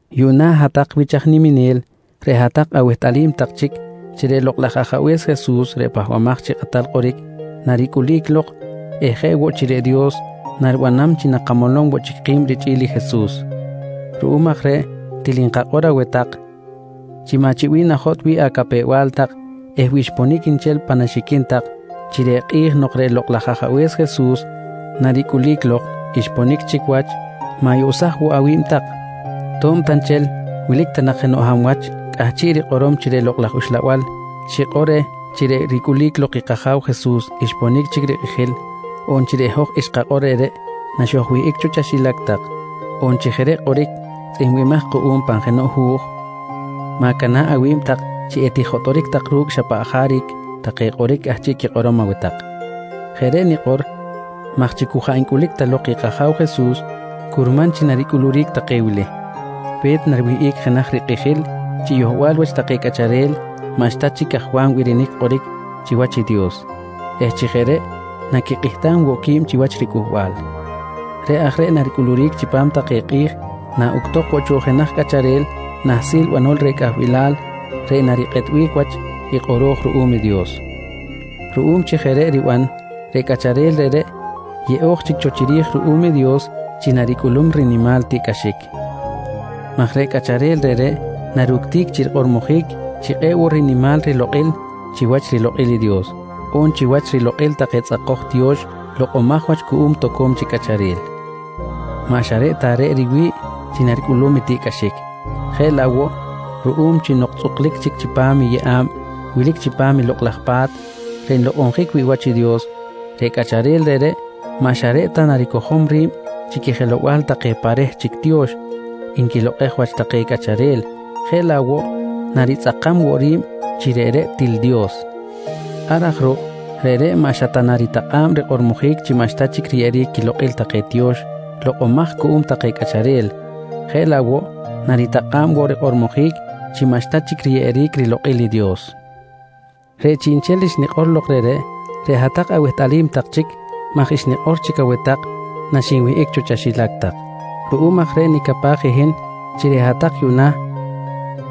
Yuꞌna hat-tak wich aj niminel, reꞌ hat-tak awehtꞌalim tak chic chi reꞌ Lokꞌ laj Ajabe̱s Jesus reꞌ Pahbamaj chi Kꞌatal Kꞌoric, naricꞌulic lok eh jeꞌ woꞌ chi reꞌ Dios naribanam chi nakamolom woꞌ chic ki̱b richꞌi̱l i Jesus. Ruꞌum aj reꞌ til nkakꞌor aweh tak chi maꞌ chi bih najotꞌ wi̱ꞌ acapew-bal tak eh wi xponic nchel pan axiquin tak chi reꞌ kꞌi̱j nok reꞌ Lokꞌ laj Ajabe̱s Jesus naricꞌulic lok xponic chic wach, ma̱yoꞌsaj woꞌ awi̱b tak. To̱b ta nchel wilic ta nak jenoꞌ hab wach cꞌahchiꞌ rikꞌorom chi reꞌ Lokꞌ laj Uxlabal xikꞌor reh chi reꞌ ricꞌulic lok i kAja̱w Jesus xponic chic rikꞌijil, on chi reꞌ hoj xkakꞌor reꞌreꞌ naxojwihꞌic cho chaxilac tak, on chi jeꞌ reꞌ kꞌoric tzꞌihmbimaj kuꞌum pan jenoꞌ hu̱j, ma̱cana̱ꞌ awi̱b tak chi etijotꞌoric tak ru̱cꞌ xa paꞌ jaric take kꞌoric cꞌahchiꞌ rikꞌorom aweh tak. Jeꞌ reꞌ nikꞌor maj chi cu jaꞌ ncꞌulic ta lok i kAja̱w Jesus, curman chi naricꞌuluric take wili: Pe̱t nariwihꞌic jenaj rikꞌijil chi yohbal wach take cꞌacharel maꞌxta chic cajwam birinic kꞌoric chiwach i Dios eh chi jeꞌ reꞌ naquikꞌihtam woꞌ qui̱b chiwach riCꞌuhbal. Reꞌ aj reꞌ naricꞌuluric chipam take kꞌi̱j naꞌuctok woꞌ cho jenaj cꞌacharel nahsil banol reh cꞌahbilal reꞌ narikꞌetbic wach i kꞌoro̱j ruꞌum i Dios. Ruꞌum chi jeꞌ reꞌ riban, reꞌ cꞌacharel reꞌreꞌ yeꞌo̱j chic cho chiri̱j ruꞌum i Dios chi naricꞌulum i rinimal tiꞌcꞌaxic maj reꞌ cꞌacharel reꞌreꞌ naructic chi rikꞌormojic chi kꞌe̱ꞌ woꞌ rinimal rilokꞌil chiwach rilokꞌil i Dios, on chiwach rilokꞌil take tzꞌakoj tiyo̱x lokꞌomaj wach cuꞌum toco̱m chic cꞌacharel. Maꞌ xa reꞌ ta reꞌ riwi̱ꞌ chi naricꞌulum tiꞌcꞌaxic, jeꞌ laꞌ woꞌ ruꞌum chi nok tzꞌuklic chic chipam i yeꞌa̱b wilic chipam i Lokꞌ laj Pa̱t reꞌ nlokꞌonjic wi̱ꞌ wach i Dios, reꞌ cꞌacharel reꞌreꞌ maꞌ xa reꞌ ta naricojom ri̱b chi quijelow-bal take pa reh chic tiyo̱x nquilokꞌej wach take cꞌacharel jeꞌ laꞌ woꞌ naritzꞌakam woꞌ ri̱b chi reꞌreꞌ til Dios. Ar aj ruꞌ, reꞌreꞌ maꞌ xa ta naritakꞌa̱b rikꞌormojic chi maꞌxta chic riyeꞌeric quilokꞌil take tiyo̱x lokꞌomaj cuꞌum take cꞌacharel, jeꞌ laꞌ woꞌ naritakꞌa̱b woꞌ rikꞌormojic chi maꞌxta chic riyeꞌeric rilokꞌil Dios. Reꞌ chiꞌnchel xnikꞌor lok reꞌreꞌ, reꞌ hat-tak awehtꞌalim tak chic maj xnikꞌor chic cho aweh tak naxinwihꞌic cho chaxilac tak. Ruꞌum aj reꞌ nicapaj i hin chi reꞌ hat-tak yuꞌna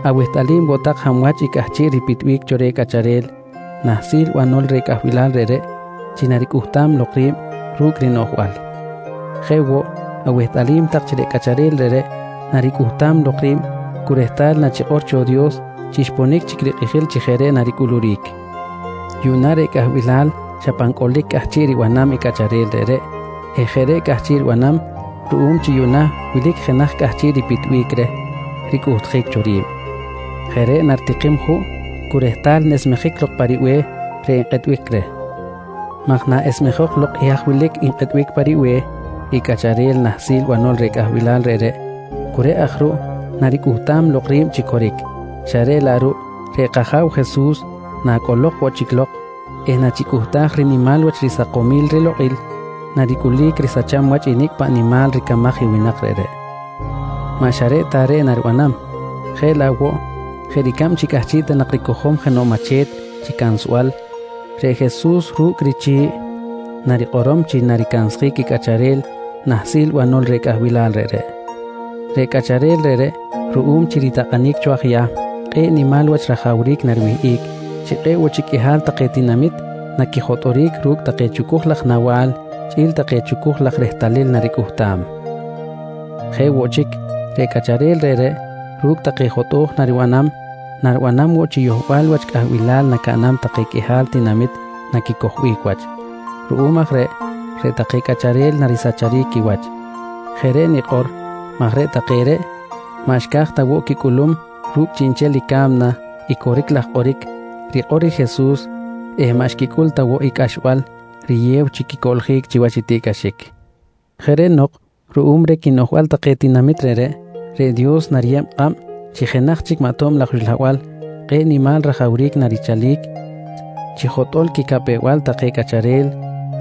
awehtꞌalim woꞌ tak hab wach i cꞌahchiꞌ ripitbic cho reh cꞌacharel nahsil banol reh cꞌahbilal reꞌreꞌ chi naricꞌuhtam lok ri̱b ru̱cꞌ rinoꞌjbal. Jeꞌ woꞌ, awehtꞌalim tak chi reꞌ cꞌacharel reꞌreꞌ naricꞌuhtam lok ri̱b cu rehtal nachikꞌor cho Dios chi xponic chic rikꞌijil chi jeꞌ reꞌ naricꞌuluric. Yuꞌna reꞌ cꞌahbilal xa pan cꞌolic cꞌahchiꞌ ribanam i cꞌacharel reꞌreꞌ eh jeꞌ reꞌ cꞌahchiꞌ ribanam ruꞌum chi yuꞌna wilic jenaj cꞌahchiꞌ ripitbic reh ricꞌuhtjic cho ri̱b. Jeꞌ reꞌ naritikim juꞌ cu rehtal nesmejic lok pa ribe̱h reꞌ nkꞌetbic reh maj naꞌesmejok lok i haj wilic nkꞌetbic pa ribe̱h i cꞌacharel nahsil banol reh cꞌahbilal reꞌreꞌ, cu reꞌ aj ruꞌ naricꞌuhtam lok ri̱b chi coric, xa reꞌ laꞌ ruꞌ reꞌ kAja̱w Jesus nacꞌolok woꞌ chic lok eh nachicꞌuhtaj rinimal wach risakomil rilokꞌil, naricꞌulic risacham wach nicꞌ paꞌ nimal ricamaj i winak reꞌreꞌ. Maꞌ xa reꞌ ta reꞌ naribanam, jeꞌ laꞌ woꞌ jeꞌ ricab chi cꞌahchiꞌ ta nak ricojom jenoꞌ mache̱t chi cansbal, reꞌ Jesus ru̱cꞌ richi̱ꞌ narikꞌorom chi naricansjic i cꞌacharel nahsil banol reh cꞌahbilal reꞌreꞌ. Reꞌ cꞌacharel reꞌreꞌ, ruꞌum chi ritakꞌanic cho aj Yahm kꞌe̱ꞌ rinimal wach rajawric nariwihꞌic chi kꞌe̱ꞌ woꞌ chic qꞌuihal take tinamit naquijotꞌoric ru̱cꞌ take chucuj laj nawa̱l chꞌi̱l take chucuj laj rehtalil naricꞌuhtam. Jeꞌ woꞌ chic, reꞌ cꞌacharel reꞌreꞌ ru̱cꞌ take jotꞌo̱j naribanam, naribanam woꞌ chi yohbal wach cꞌahbilal nacaꞌnam take qꞌuihal tinamit naquicojbic wach. Ruꞌum aj reꞌ, reꞌ take cꞌacharel narisacharic quiwach. Jeꞌ reꞌ nikꞌor maj reꞌ take reꞌ maꞌ xca̱j ta woꞌ quicꞌulum ru̱cꞌ chiꞌnchel i ca̱mna i coric laj kꞌoric rikꞌor i Jesus eh maꞌ xquicꞌul ta woꞌ i cꞌaxbal riyew chi quicoꞌljic chiwach i tiꞌcꞌaxic. Jeꞌ reꞌ nok ruꞌum reh quinoꞌjbal take tinamit reꞌreꞌ, reꞌ Dios nariyeb kꞌab chi jenaj chic maꞌ tob laj uxlabal kꞌe̱ꞌ nimal rajawric narichalic chi jotꞌo̱l quicapew-bal take cꞌacharel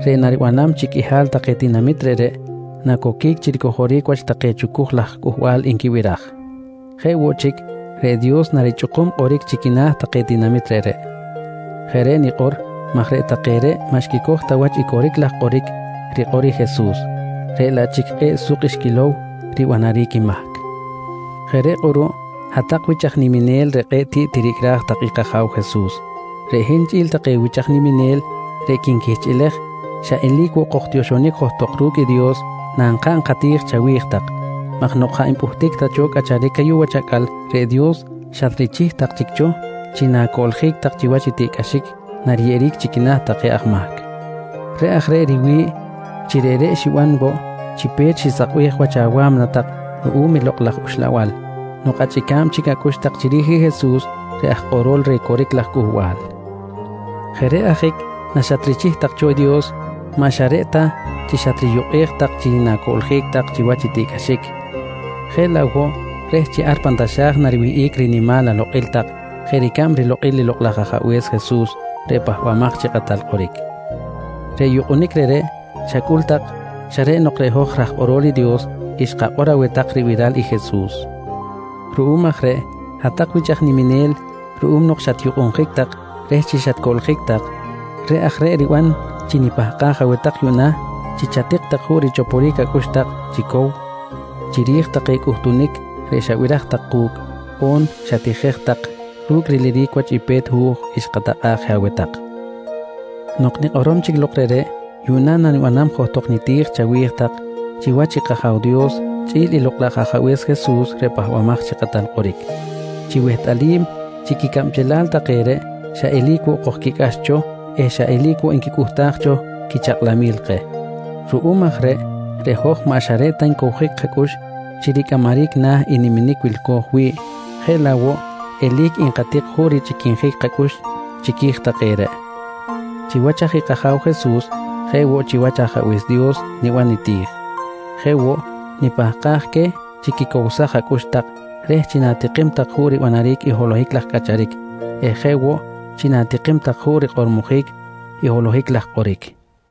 reꞌ naribanam chi qꞌuihal take tinamit reꞌreꞌ nacoquic chi ricojoric wach take chucuj laj cꞌuhbal nquibiraj. Jeꞌ woꞌ chic, reꞌ Dios narichꞌukum kꞌoric chi quina̱ take tinamit reꞌreꞌ. Jeꞌ reꞌ nikꞌor maj reꞌ take reꞌ maꞌ xquicoj ta wach i coric laj kꞌoric rikꞌor i Jesus reꞌ laꞌ chic kꞌe̱ꞌ suk xquilow ribanaric i mahc. Jeꞌ reꞌ kꞌuruꞌ hat-tak wich tak aj niminel reꞌ kꞌe̱ꞌ tiꞌ tiricꞌraj tak i kAja̱w Jesus, reꞌ hin chꞌi̱l take wich aj niminel reꞌ quinquihchꞌilej xa eli̱c woꞌ kojtioxonic johtok ru̱cꞌ i Dios nankaꞌn kati̱j chawi̱j tak maj nok jaꞌ npꞌuhtic ta cho cꞌacharic ayuꞌ wach acꞌal, reꞌ Dios xatrichih tak chic cho chi na̱coꞌljic tak chiwach i tiꞌcꞌaxic nariyeꞌeric chi quina̱ take aj mahc. Reꞌ aj reꞌ riwi̱ꞌ chi reꞌreꞌ xiban woꞌ chi pe̱t xisakbej wach awa̱mna tak ruꞌum i Lokꞌ laj Uxlabal nok achꞌica̱b chic acꞌux tak chiri̱j i Jesus reꞌ aj kꞌorol reh coric laj cꞌuhbal. Jeꞌ reꞌ ajic naxatrichih tak cho i Dios maꞌ xa reꞌ ta chi xatriyukꞌej tak chi na̱coꞌljic tak chiwach i tiꞌcꞌaxic jeꞌ laꞌ woꞌ reh chi ar pan taxa̱j nariwihꞌic rinimal alokꞌil tak jeꞌ ricab rilokꞌil i Lokꞌ laj Ajabe̱s Jesus reꞌ Pahbamaj chi Kꞌatal Kꞌoric. Reꞌ yukꞌunic reꞌreꞌ xacꞌul tak xa reꞌ nok reꞌ hoj raj kꞌorol i Dios xkakꞌor aweh tak ribiral i Jesus. Ruꞌum aj reꞌ hat-tak wich aj niminel, ruꞌum nok xatyukꞌunjic tak reh chi xatcoꞌljic tak, reꞌ aj reꞌ riban chi nipahkaj aweh tak yuꞌna chi chatik tak juꞌ richoporic acꞌux tak chi cow chiri̱j take cꞌuhtunic reꞌ xabiraj tak ku̱cꞌ on xatijej tak ru̱cꞌ riliric wach i pe̱t hu̱j xkatakꞌa̱ꞌ je aweh tak. Nok kꞌoro̱j chic lok reꞌreꞌ, yuꞌna nanibanam johtok niti̱j chawi̱j tak chiwach kAja̱w Dios chꞌi̱l i Lokꞌ laj Ajabe̱s Jesus reꞌ Pahbamaj chi Kꞌatal Kꞌoric, chi wehtꞌalim chi quicabchelal take reꞌ xa eli̱c woꞌ kojquicꞌax cho eh xa eli̱c woꞌ nquicꞌuhtaj cho quichakꞌlamil keh. Ruꞌum aj reꞌreꞌ hoj maꞌ xa reꞌ ta ncowjic kacꞌux chi ricꞌamaric na̱ i niminic wilco̱j wi̱ꞌ jeꞌ laꞌ woꞌ eli̱c nkatik juꞌ richꞌiquinjic kacꞌux chiqui̱j take reꞌ. Chiwach aj kAja̱w Jesus jeꞌ woꞌ chiwach Ajabe̱s Dios niban niti̱j. Jeꞌ woꞌ nipahkaj queh chi quicowsaj acꞌux tak reh chi na̱tikim tak juꞌ ribanaric i holohic laj cꞌacharic eh jeꞌ woꞌ chi na̱tikim tak juꞌ rikꞌormojic holohic laj kꞌoric.